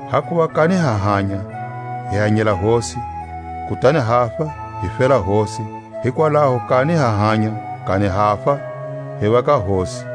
Hakuva kani ha hanya, hi hanyela Hosi; kutani hafa, hi fela Hosi; hikwalaho kani ha hanya, kani hafa, hi va ka Hosi.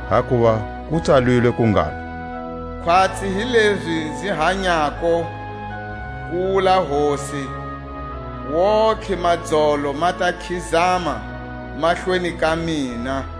Hakuva ku tsalilwe ku ngalo: Khwatsi hi lezi nzi hanyako, ku wula Hosi, wontihe madzolo ma ta khizama mahlweni ka mina,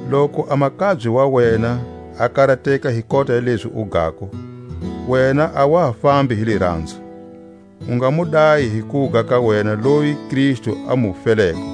Loku a makabye wa wena a karateka hi kota ya lezi u gako, wena a wa ha fambi hi liranzo. U nga mu dayi hi kuga ka wena loyi Kristu a mu feleko.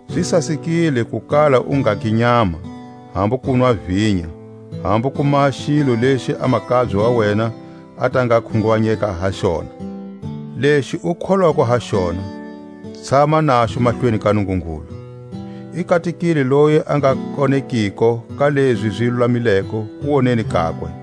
Zi sasekile ku kala u ngagi nyama, hambu kunwa vinya, hambu ku maha xilo lexi a makabye wa wena a ta nga khunguvanyeka ha xona. Lexi u kholwako ha xona, tshama naxo mahlweni ka Nungungulu. I katekile loyi a nga konekiko ka lezi zi lulamileko kuwoneni kakwe.